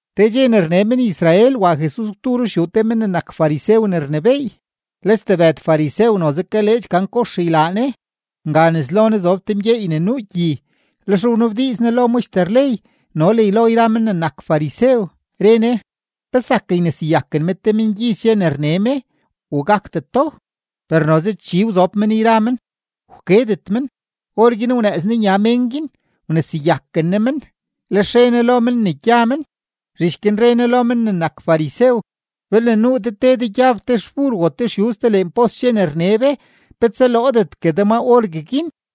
Te dxe ne rne men-Israel, wa Jesus gwdu ruxyuu te men ne nak farisew ne rnebééy. Le stebëd farisew noze kaleedx gan kox ylaa Ne. Nga nes lo Ne zob te mgyeey ne nuu gyi. Lex wnabdiiz Ne lo maxter ley no le lo yra men ne nak farisew, re Ne: ―¿Pe zak yneseyaken me te mengyiz dxe ne rne me u gakdeto? Per noze chi wzob men yra men, wkedet men. Orguin wnëëz Ne nya mén guin, wneseyaken Ne men, lex re Ne lo men ne gya men. Zhich guin re Ne lo men ne nak farisew: ―Belne nuu de te de gyab te xbur o te xyuz te leen pos dxe ne rne be, ¿pe tsaloodetgue de ma orgueguin?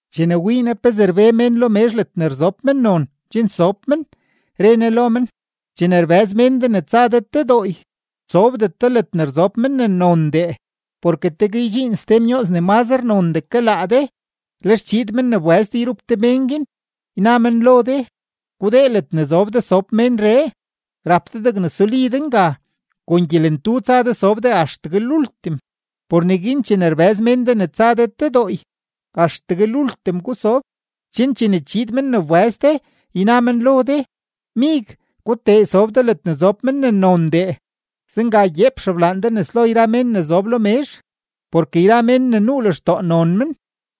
Chene wii Jesus pezee rbe mén lo mezh ledne rzob mennon chen sob men, re Ne lo men: ―Chene rbëz mén de ne tsa de te dooy, sobdet de ledne rzob men ne nondee, porke tegue ydxiin ste myooz ne mazre nondee ke laa de. Lex chiid men ne wbëz de yrup de mén guin, yna men lo de: “Gudee ledne zob de sob ménree.” Rap de degne suli de nga; kon gyelentu tsa de sob de axtegue lultim. Por neguin chene rbëz mén de ne tsa de te dooy, axtegue lultim gusob, chen chene chiid men ne wbëz de, yna men lo de: “Mig, gutee sob de ledne zob men ne nondee.” Zenga gyeep xeblaan de nes lo yra mén ne zob lo mezh. Porke yra mén ne nuu lextoo non men,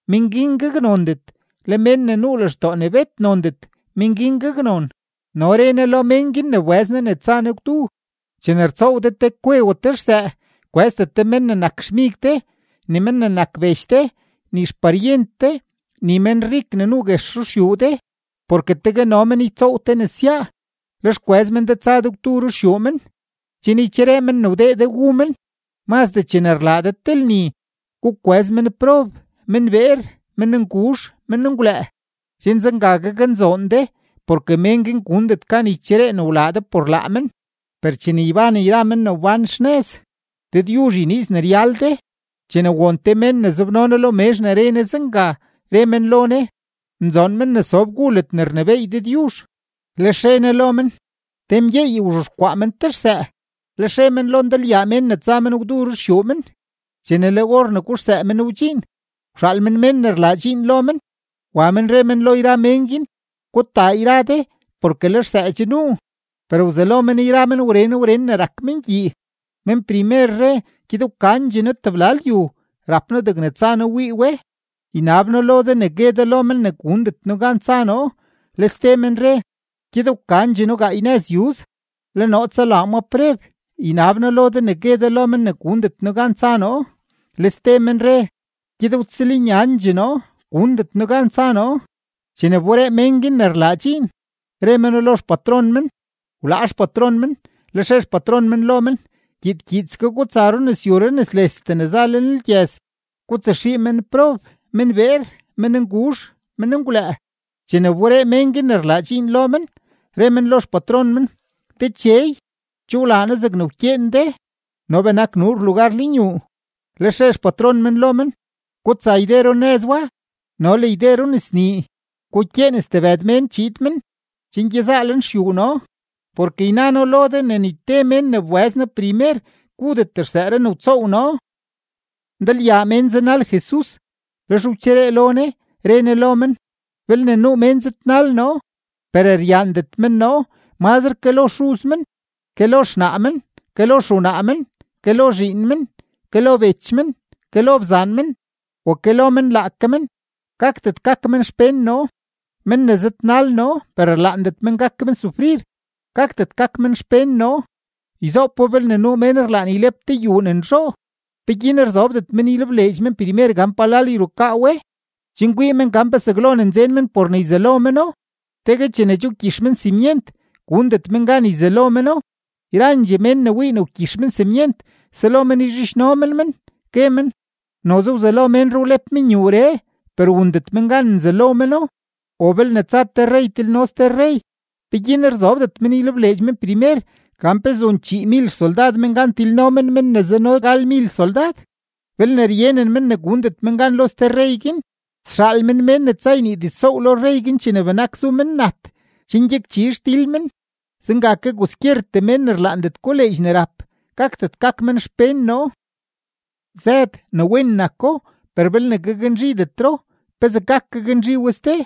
men guin gaknondet; le men ne nuu lextoo bet nondet, men guin gaknon. No re Ne lo mén guin ne wbëz Ne ne tsa Ne gwdu: ―Chene rtsoow de te kwe o te xsëë, kwëzdet de men ne nak xmig de, ni men ne nak bech de, ni xparyent de, ni menrik ne nuu guex ruxyuu de, porke tegue no men ytsoow te nesyaa, lex kwëz men de tsa de gwdu ruxyuu men, chen ycheree men ne wdee de wu men. Mazdee chene rlaa de te lni, gukwëz menprob, menbeer, mennguzh, menngwlëë, chen zenga gaknzoon de, porke men guin gundet gan ycheree ne wlaa de por laa men; per chene yban yra mén ne wbán xnëz, Dëdyuzh yniiz ne ryal de. Chene won te mén ne zobno Jesus lo mezh ne re Ne zenga, re men lo Ne: ―¡Nzoon men ne sob gu ledne rnebééy Dëdyuzh! Lex re Ne lo men: ―Te mgyeey wzhexkwaa men te xsëë, lex re men lo ndalyaa mén ne tsa men gwdu ruxyuu men. Chene le or ne guxsëë men wdxiin, wxaal men mén ne rlaa dxiin lo men, wa men re men lo yra mén guin: “Gutaa yra de porke le xsëë che nuu.” Per wzelo men yra men wren wren ne rak men gyii. Men primer re: “Gyed wkandxee noo tebla lyu; rap noo degne tsa noo wii we. Ynab noo lo de ne gue de lo men ne gundet noo gan tsa noo.” Le ste men re: “Gyed wkandxee noo gaay nëz yuz; le noo tsalaa ma preb. Ynab noo lo de ne gue de lo men ne gundet noo gan tsa noo.” Le ste men re: “Gyed wtsëlnyandxee noo; gundet noo gan tsa noo.” Chene wberee mén guin ne rlaa dxiin, re meno lo xpatron men. Wlaa xpatron men. Lex re xpatron men lo men: “Gyiid gyiidske gutsa runëzyu runëzlestee ne za lenlgyëz, gutsaxii menprob, menbeer, mennguzh, menngwlëë.” Chene wberee mén guin ne rlaa dxiin lo men, re men lo xpatron men: “Dechey, che wlaa noo zegne wkyeen de, no benak nuur lugar lenyuu.” Lex re xpatron men lo men: “Gutsa yde runëz wa no le yde runëznii; gukyeen stebëd mén chiid men, chen gyezaa lenxyuu noo. Porke yna noo lo de ne ni te mén ne wbëz noo primer, gudet xsëëree ne wtsoow noo.” Ndalyaa mén zanal Jesus; lex wcheree lo Ne, re Ne lo men: ―Belne nuu mén zëdnal noo, per ryaandet men noo mazre ke lo xuz men, ke lo xnaa men, ke lo xewnaa men, ke lo zhiin men, ke lo bech men, ke lo bzaan men, o ke lo men laake men, gakdet gak men xpén noo. Men ne zëdnal noo, per rlaandet men gak men sufrir, gakdet gak men xpén noo. Yzoopo, belne nuu mén rlaan ylep te yuu ne nzhoo, ¿peguin rzobdet men ylebleedx men primer gan palal yrukaa we, chen kwii men gan pe zaglo ne nzen men por ne yzalo meno? Tegue chene che wgyix men simyent, gundet men gan yzalo meno; yrandxee mén ne wii wgyix men simyent, selo men yzhidxno men men, gue men: “Noze wzelo ménree wlep men yuuree, per wundet men gan nzalo meno.” O belne tsa te rrey tilno ste rrey, ¿peguin rzobdet men ylebleedx men primer gan pe zun chiimil xsoldad men gan tilno men men ne zano galmil soldad? Belne ryenen men ne gundet men gan lo ste rrey guin, sxaal men mén ne tsa ynii diztsoow lo rrey guin chene benak zu men nat, chen gyakchi xdil men. Zenga ke kwaskyertee mén ne rlaandet koleedx ne rap, gakdet gak men xpén noo. ’Zëd, ne wen nako; per belne gaknzhidetro, ¿pezee gak gaknzhi we ste?